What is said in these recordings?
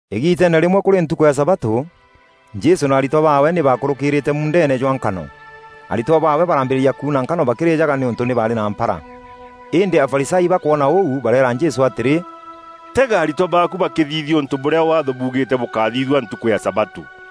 Îgiiteene rîmwe kûrî ntukû ya sabatû, Jesû na aritwa baawe nî bakûrûkîrîîte muundeene jwa nkano. Aritwa baawe barambîrîria kuuna nkano bakîrîjaga, nîûntû nî baarî na mpara. Îndî Afarisayo bakwona ûu bareera Jesû atîrî, “Tega aritwa baaku bakîthithia ûntû bûrîa Waatho buugîîte bûkáthithua ntukû ya sabatû!”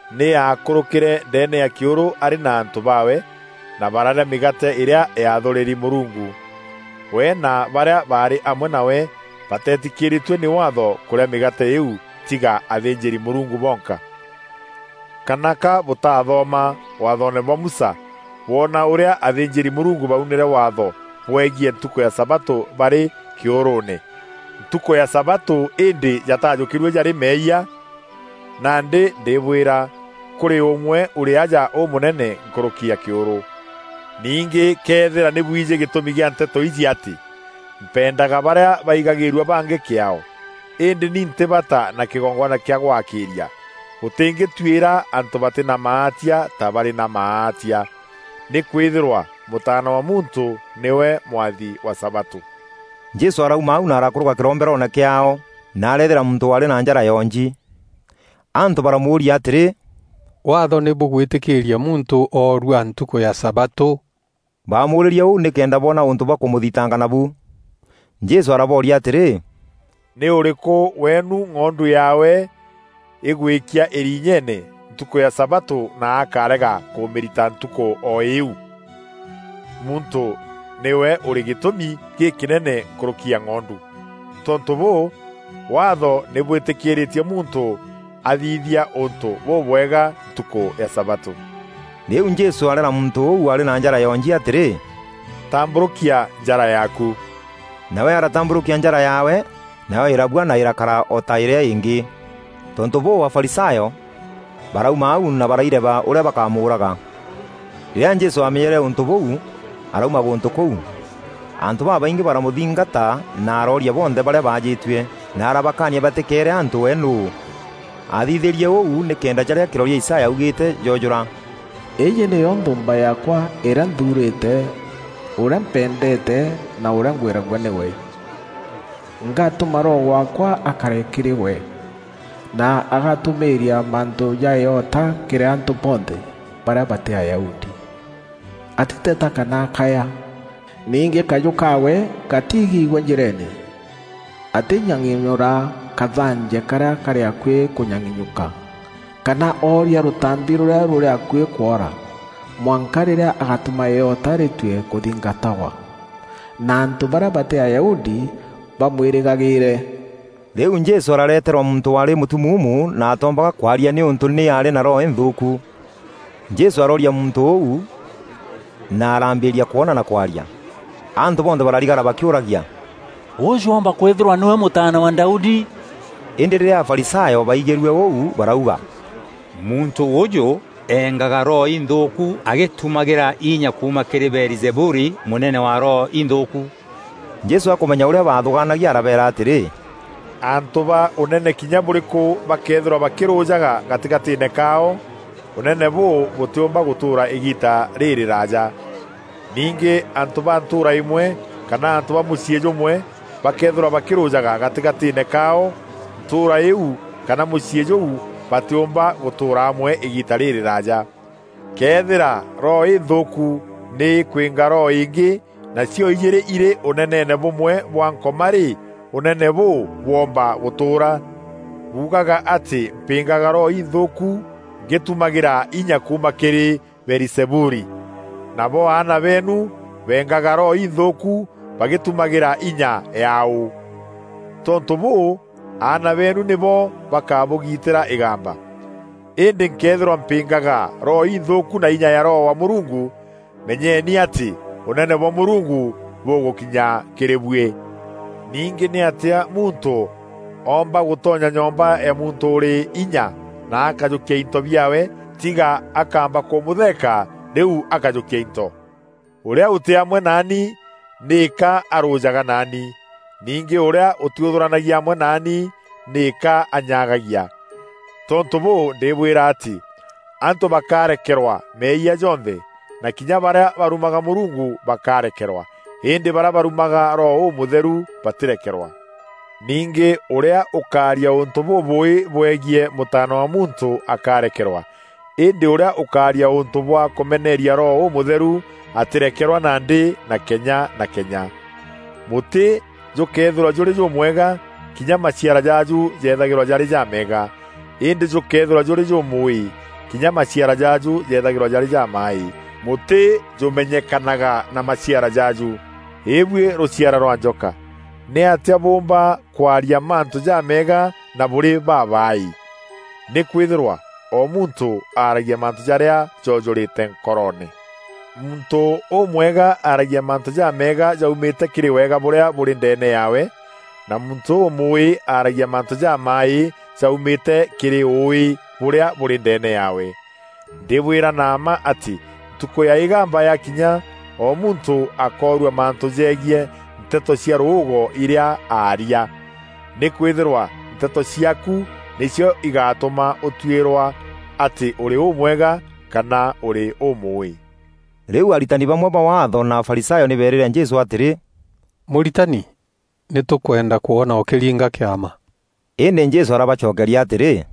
Nî aakûrûkîre ndeene ya kîûrû arî na antû baawe, na bararîa mîgaate îrîa yaathûrîri Mûrungu. We na barîa baarî amwe nawe batetîkîrîîtue nî Waatho kûrîa mîgaate îîu tiga athînjîri-Mûrungu bonka. Kana ka bûtaathoma Waathoone bwa Musa bwona ûrîa athînjîri-Mûrungu baunîre Waatho bwegiî ntukû ya sabatû barî kîûrûûne, ntukû ya sabatû îndî jatajukîrue jarî meeyia? Nandî ndîbwîra, kûrî ûmwe ûrî aja ûmûnene nkûrûki ya kîûrû. Ningî këethîra nî bwijî gîtûmi gîa nteto iji atî, ‘Mpendaga barîa baigagîrua bangî kîaao, îndî ni ntî bata na kîgongwana kîa gwakîîria,’ bûtîngîtuîra antû batî na maatia ta barî na maatia. Nîkwîthîrwa Mûtaana wa Muntû nîwe mwathi wa sabatû.” Jesû arauma au na arakûrûka kîromberoone kîaao na areethîra muntû waarî na njara yonji. Antû baramûûria atîrî, “Waatho nî bûgwîtîkîîria muntû orua ntukû ya sabatû?” Baamûûrîrie ûû nîkenda boona ûntû bwa kûmûthitanga nabu. Jesû arabooria atîrî, “Nî ûrîkû weenu ng'ondu yaawe îgwîkia îriinyeene ntukû ya sabatû na akarega kûmîrita ntukû o îîu? Muntû nîwe ûrî gîtûmi gîkînene nkûrûki ya ng'ondu. Tontû bûû, Waatho nî bwîtîkîîrîtie muntû athithia ûntû bûbwega ntukû ya sabatû.” Rîu Jesû areera muntû ûu waarî na njara yonji atîrî, “Tambûrûkia njara yaaku.” Nawe aratambûrûkia njara yaawe, nayo îrabua na îrakara o ta îrîa îngî. Tontû bûû, Afarisayo barauma au na baraireba ûrîa bakamûûraga. Rîrîa Jesû amenyere ûntû bûû arauma gûntû kûu. Antû babaingî baramûthingata na arooria bonthe barîa baajîtue, na arabakaania batîkeere antû we nûû. Athithîriee ûu nîkenda jarîa kîroria Isaya augîîte joojûra: “Îîjî nîyo nthûûmba yaakwa îrîa nthuurîte, ûrîa mpendeete na ûrîa ngwîragua nîwe. Ngatûma Roho waakwa akare kîrî we, na agatûmîîria mantû ja îota kîrî antû bonthe barîa batî Ayahudi. Atîteta kana akaya, ningî kajû kaawe gatiigîgua njîreene. Atînyang'inyûra kathanje karîa karî akuî kûnyang'inyûka, kana oorîa rûtambi rûrîa rûrî akuî kwoora, mwanka rîrîa agatûma îota rîtue kûthingatagwa, na antû barîa batî Ayahudi bamwîrîgagîîre.” Rîu Jesû arareeterwa muntû waarî mûtumuumu na atoombaga kwaria nîûntû nî aarî na roho inthûûku. Jesû arooria muntû ûu na arambîria kwona na kwaria. Antû bonthe bararigara bakîûragia, “Ûjû oomba kwîthîrwa nîwe Mûtaana wa Daudi?” Îndî rîrîa Afarisayo baigîrue ûu barauga, “Muntû ûjû engaga roho inthûûku agîtumagîra inya kuuma kîrî Beelizebuli, mûnene wa roho inthûûku.” Jesû akûmenya ûrîa baathûgaanagia arabeera atîrî, “Antû ba ûnene kinya bûrîkû bakeethîrwa bakîrûjaga gatîgatîîne kaao, ûnene bûu bûtîûmba gûtûûra îgiita rîrîraja. Ningî antû ba ntûûra îmwe kana antû ba mûciî jûmwe bakeethîrwa bakîrûjaga gatîgatîîne kaao, ntûûra îîu kana mûciî jûu, batîûmba gûtûûra amwe îgiita rîrîraja. Këethîra roho îthûûku nî îkwînga roho îngî na cio-ijîîrî îrî ûneneene bûmwe bwa Nkoma rî, ûnene bûu bwoomba gûtûûra? Buugaga atî mpîngaga roho inthûûku ngîtumagîra inya kuuma kîrî Beelizebuli, nabo aana beenu beengaga roho inthûûku bagîtumagîra inya yaaû? Tontû bûû, aana beenu nîbo bakabûgiitîra îgamba. Îndî nkëethîrwa mpîngaga roho inthûûku na inya ya Roho wa Mûrungu, menyeni atî Ûnene bwa Mûrungu bûgûkinya kîrî buî. Ningî nîatîa muntû oomba gûtonya nyomba ya muntû ûrî inya na akajûkia into biaawe, tiga akaamba kûmûtheeka rîu akajûkia into. Ûrîa ûtî amwe naani, nîka arûjaga naani. Ningî ûrîa ûtîûthûranagia amwe naani nîka anyagagia. Tontû bûû, ndîbwîra atî antû bakarekerwa meeyia jonthe, na kinya barîa barumaga Mûrungu bakarekerwa, îndî barîa barumaga Roho Ûmûtheru batîrekerwa. Ningî ûrîa ûkaaria ûntû bûbûûî bwegiî Mûtaana wa Muntû akarekerwa, îndî ûrîa ûkaaria ûntû bwa kûmeneeria Roho Ûmûtheru atîrekerwa nandî na kenya na kenya.” “Mûtî jûkëethîrwa jûrî jûmwega, kinya maciara jaaju jeethagîrwa jarî jameega, îndî jûkëethîrwa jûrî jûmûûî, kinya maciara jaaju jethagîrwa jarî jamaaî. Mûtî jûmenyekanaga na maciara jaaju. Îbuî rûciara rwa njoka! Nîatîa bûûmba kwaria mantû jameega na bûrî babaaî? Nîkwîthîrwa o muntû aragia mantû jarîa jojûrîte nkoroone. Muntû ûmwega aragia mantû jameega jaumîte kîrî wega bûrîa bûrî ndeene yaawe, na muntû ûmûûî aaragia mantû jamaaî jaumîte kîrî ûûî bûrîa bûrî ndeene yaawe. “Ndîbwîra na mma atî Ntukû ya Îgamba yakinya o muntû akoorua mantû jegiî nteto cia rûûgo irîa aaria. Nîkwîthîrwa nteto ciaaku nîcio igatûma ûtuîrwa atî ûrî ûmwega kana ûrî ûmûûî.” Rîu aritani bamwe ba Waatho na Afarisayo nî beerîre Jesû atîrî, “Mûritani, nî tûkwenda kwona ûkîringa kîama.” Îndî Jesû arabacokeria atîrî,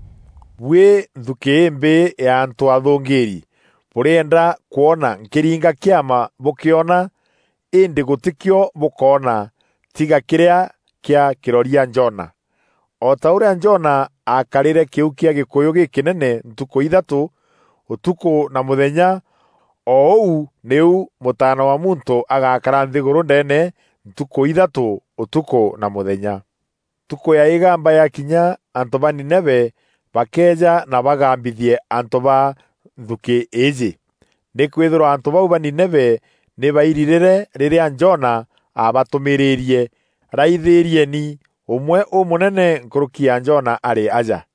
“Buî nthukî îmbîî ya antû athûngîîri! Bûrîenda kwona nkîringa kîama bûkîona, îndî gûtîkîo bûkoona tiga kîrîa kîa kîroria Jona. O ta ûrîa Jona aakarîre kîu kîa gîkûyû gîkînene ntukû ithatû, ûtukû na mûthenya, o ûu nîu Mûtaana wa Muntû agakara nthîgûrû ndeene, ntukû ithatû, utukû na mûthenya. Ntukû ya Îgamba yakinya antû ba Nineve bakeeja na bagambithie antû ba nthukî îîjî, nîkwîthîrwa antû bau ba Nineve nî bairirîre rîrîa Jona aabatûmîîrîrie. Raithîrieni! Ûmwe ûmûnene nkûrûki ya Jona arî aja.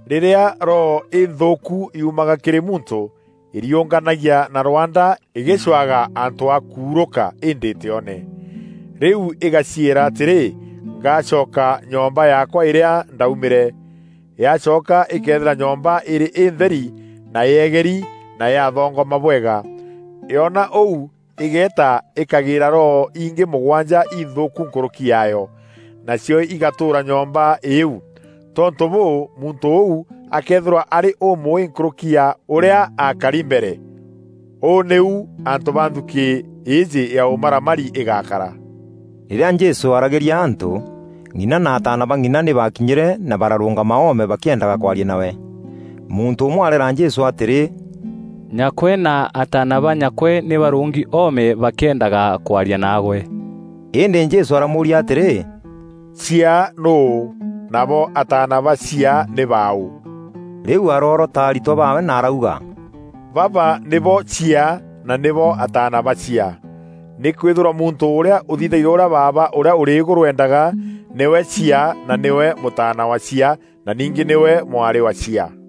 “Rîrîa roho înthûûku yuumaga kîrî muntû îriûnganagia na rwanda îgîcûaga antû a kuurûka, îndî îtîone. Rîu îgaciîra atîrî, ‘Ngacoka nyomba yaakwa îrîa ndaumîre.’ Yacoka îkeethîra nyomba îrî întheri na yeegeri na yathongoma bwega. Yoona ûu îgeeta îkagîîra roho ingî mûgwanja inthûûku nkûrûki yaayo, naacio igatûûra nyomba îîu. Tontû bûû, muntû ûu akeethîrwa arî ûmûûî nkûrûki ya ûrîa aakari mbere. Ûû nîu antû ba nthukî îîjî ya ûmaramari îgakara.” Rîrîa Jesû aaragîria antû, ng'ina na ataana ba ng'ina nî baakinyîre na bararûngama oome bakîendaga kwaria nawe. Muntû ûmwe areera Jesû atîrî, “Nyakwe na ataana ba nyakwe nî barûngi oome bakîendaga kwaria naagwe.” Îndî Jesû aramûûria atîrî, “Chiaa nûû? Nabo ataana ba chiaa nî baaû?” Rîu aroorota aritwa baawe na arauga, “Baba nîbo chiaa na nîbo ataana ba chiaa! Nîkwîthîrwa muntû ûrîa ûthithagia ûrîa Baaba ûrîa ûrî îgûrû endaga, nîwe chiaa na nîwe mûtaana wa chiaa na ningî nîwe mwarî wa chiaa.”